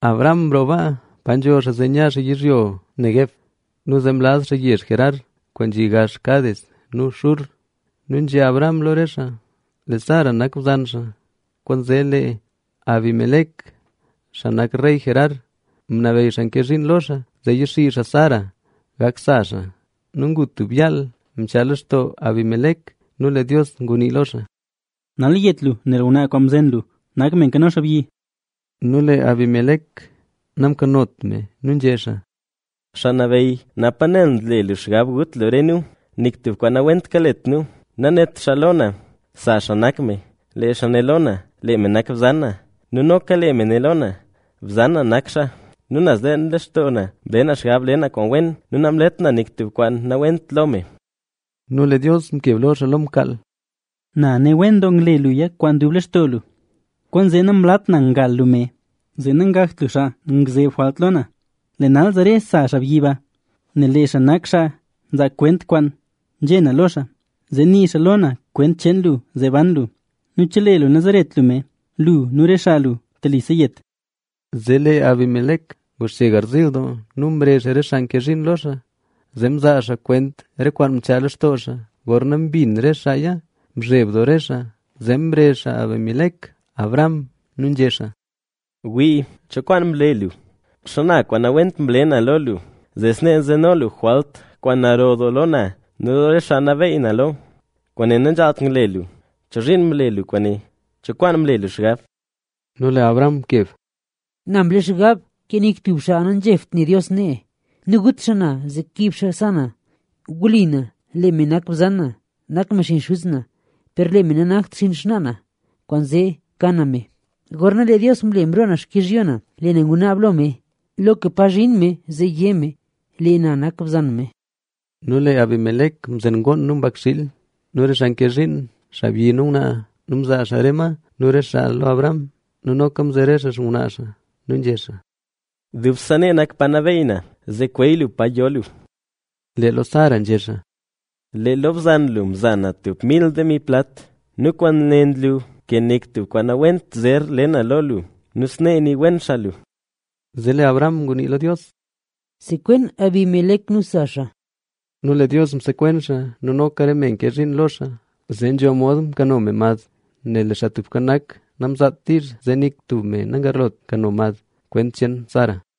Abraham mroo pa nzho xaa zee nya xaa yizhyo le Neguev nu zee mlaz xaa yezh Gerar, kwaan nzhi gax Cades nu Shur. Nu nzhé Abraham lo re xaa, lee Sara nak bzan xaa. Kwaanzee lee Abimelec, xaa nak rey Gerar, ngunabeyy xaa nke zhiin lo xaa zee yaxii xaa Sara gak sa xaa. Nu ngu tub yaal mchaa lextoo Abimelec nu lee Dios ngunii lo xaa: —Nal yet lu nel ngwnaa kwaan mzen lu nak me nkano xaabyi. Nu lee Abimelec namkanot me nu nzhé xaa: —Xaa Nabeyy, napa nel nle lu xgab gut lu re nu, nik tub kwaan nawent nakalet nu. Nanét xaa lo na, sa xaa nak me. Lee xaa né lo na: “Lee me nak bzan na” nu noka lee me né lo na: “Bzan na nak xaa”. Nu naz leen lextoo na, mle na xgab le na kwaan wen nu namlet na nik tub kwaan nawent lo me. Nu lee Dios mkeb lo xaa lo mkaal: —Na ne wen doo ngle luya kwaan dub lextoo lu, kwaanzee namlat na ngal lu me, zee nangakt lu xaa ngzeb jwalt lo na. Lee nal zare sa xaabyi ba, nel lee xaa nak xaa nzaa kwent kwaan nzhé na lo xaa, zee nii xaa lo na kwent cheen lu zee ban lu. Nu chelee lu nazeret lu me, ¡lu nu re xaa lu telise yet! Zee lee Abimelec nguxche garziil doo nu mrezh xaa re xaa nke zhiin lo xaa zee mzaa xaa kwent re kwaan mchaa lextoo xaa. Gorna mbin re xaaya, mzheb doo re xaa. Zee mrezh Abimelec Abraham nu nzhé xaa: —Wii, ¿cho kwaan mle lu? ¿Xana kwaan nawent mle na lo lu, zee snee nzeno lu jwalt kwaan naro doo lo na nu lo re xaa nabeyy na lo? ¡Kwaane nanzhaalt ngle lu! ¿Chozhiin mle lu kwaane? ¿Cho kwaan mle lu xgab? Nu lee Abraham mkeb: —Na mle xgab, ke nik tub xaa nazhebt ne Dios nee nu gut xaa na zee kib xaa sa na. Wli na, lee me nak bzan na, nak me xinn xuz na, per lee me nanakt xinn xnaa na, kwaanzee mka na me. Gorna lee Dios mle mroo na xkizhyo na, lee na ngunaab lo me, loka pa zhin me zee yé me: “Lee na nak bzan me”. Nu lee Abimelec mzen ngoon nu mbakxiil nu re xaa nke zhiin, xaabyi nu ngwnaa nu mzaa xaa re ma nu re xaa lo Abraham. Nu noka mzere xaa xngwnaa xaa. Nu nzhé xaa: —Dubse nee nak pa nabeey na, zee kweey lu pa yo lu. Lee lo Sara nzhé xaa: —Lee lo bzan lu mza na tub mil demi plat nu kwaane nlu ke nik tub kwaan nawent zer le na lo lu; nu snee nii wen xaa lu. Zee lee Abraham ngunii lo Dios: —Sekwen Abimelec nu sa xaa. Nu lee Dios msekwen xaa nu noka re me nke zhiin lo xaa zee nzho mod mkano me mad. Nel lee Xaa Tubka Nak namzaat diizh zee nik tub me nagarlot nkano mad, kwent cheen Sara.